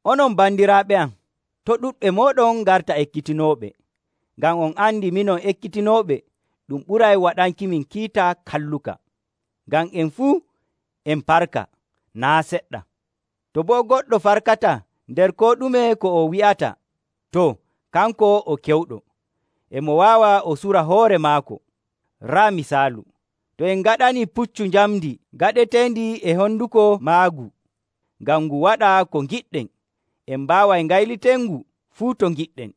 Onon bandiraaɓe am, to' ɗuɗɓe mooɗon ngarta ekkitinooɓe, ngam on andi minon ekkitinooɓe ɗum ɓuray waɗankimin kiita kalluka. Ngam en fuu en parka naa' seɗɗa. To boo goɗɗo farkataa nder koo ɗume ko o wi'ata, too, kanko o kewɗo, e mo waawa o sura hoore maako. Raa misaalu. To en ngaɗanii puccu njamndi gaɗeteendi e honduko maagu ngam ngu waɗa ko ngiɗɗen, en mbaaway ngaylitenngu fuu to ngiɗɗen.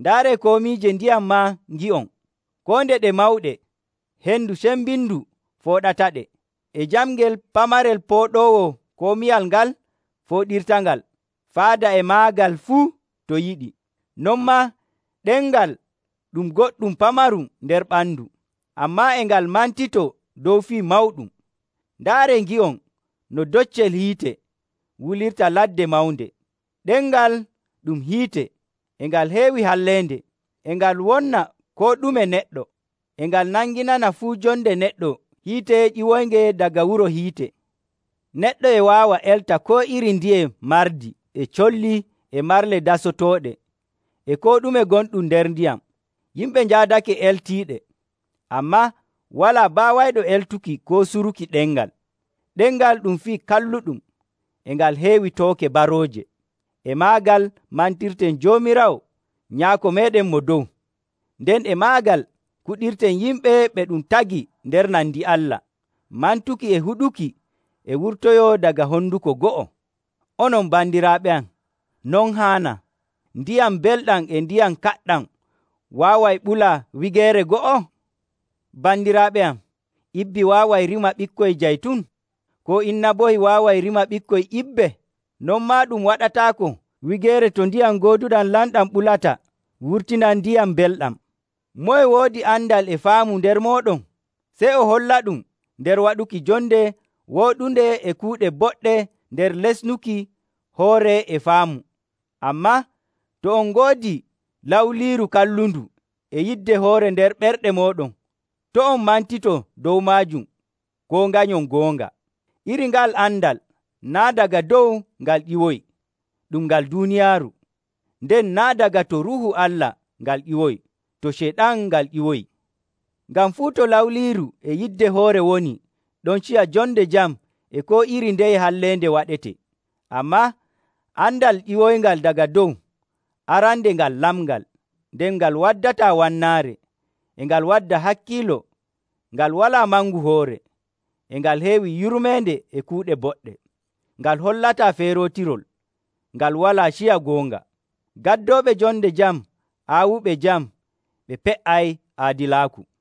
Ndaaree komiije ndiyam maa ngi'on. Koo nde ɗe mawɗe, hendu cembindu fooɗataɗe, e jamngel pamarel pooɗoowo komiwal ngal fooɗirtangal faada e maagal fuu to yiɗi. Non maa, ɗemngal ɗum goɗɗum pamarum nder ɓandu, ammaa e ngal mantitoo dow fii mawɗum. Ndaaree ngi'on no doccel hiite wulirta ladde mawnde. Ɗemngal ɗum hiite, e ngal heewi halleende, e ngal wonna koo ɗume neɗɗo. E ngal nanginana fuu jonde neɗɗo hiite ƴiwoynge daga wuro hiite. Neɗɗo e waawa elta koo iri ndiye mardi, e colli, e marle dasotooɗe, e koo ɗume gonɗum nder ndiyam. Yimɓe njaadake eltiiɗe. Ammaa walaa baawayɗo eltuki koo suruki ɗemngal. Ɗemngal ɗum fii kalluɗum, e ngal heewi tooke barooje. E maagal mantirten Joomiraawo Nyaako meeɗen Mo Dow, nden e maagal kuɗirten yimɓe ɓe ɗum tagi nder nandi Allah. Mantuki e huɗuki e wurtoyoo daga honduko go'o. Onon bandiraaɓe am, non haanaa. Ndiyam mbelɗam e ndiyam kaɗɗam waaway ɓula wigeere go'o? Bandiraaɓe am, ibbi waaway rima ɓikkoy jaytun? Koo inabohi waaway rima ɓikkoy ibbe? Non maa ɗum waɗataako wigeere to ndiyam gooduɗam lamɗam ɓulata wurtina ndiyam mbelɗam. Moye woodi andal e faamu nder mooɗon? Sey o hollaɗum nder waɗuki jonde wooɗunde e kuuɗe boɗɗe nder lesnuki hoore e faamu. Ammaa to on ngoodi lawliiru kallundu e yidde hoore nder ɓerɗe mooɗon, to' on mantito dow maajum koo nganyon goonga. Iri nga'al andal naa' daga dow ngal ƴiwoyi, ɗum ngal duuniyaaru. Nden naa' daga to Ruuhu Allah ngal ƴiwoyi, to Ceyɗan ngal ƴiwoyi. Ngam fuu to lawliiru e yidde hoore woni, ɗon ciya jonde jam e koo iri ndeye halleende waɗetee. Ammaa andal ƴiwoyngal daga dow, arande ngal lamngal, nden ngal waddataa wannaare, e ngal wadda hakkiilo, ngal walaa mangu hoore, e ngal heewi yurmeende e kuuɗe boɗɗe. Ngal hollataa feerootirol, ngal walaa ciya goonga. Gaddooɓe jonde jam aawuɓe jam, ɓe pe''ay aadilaaku.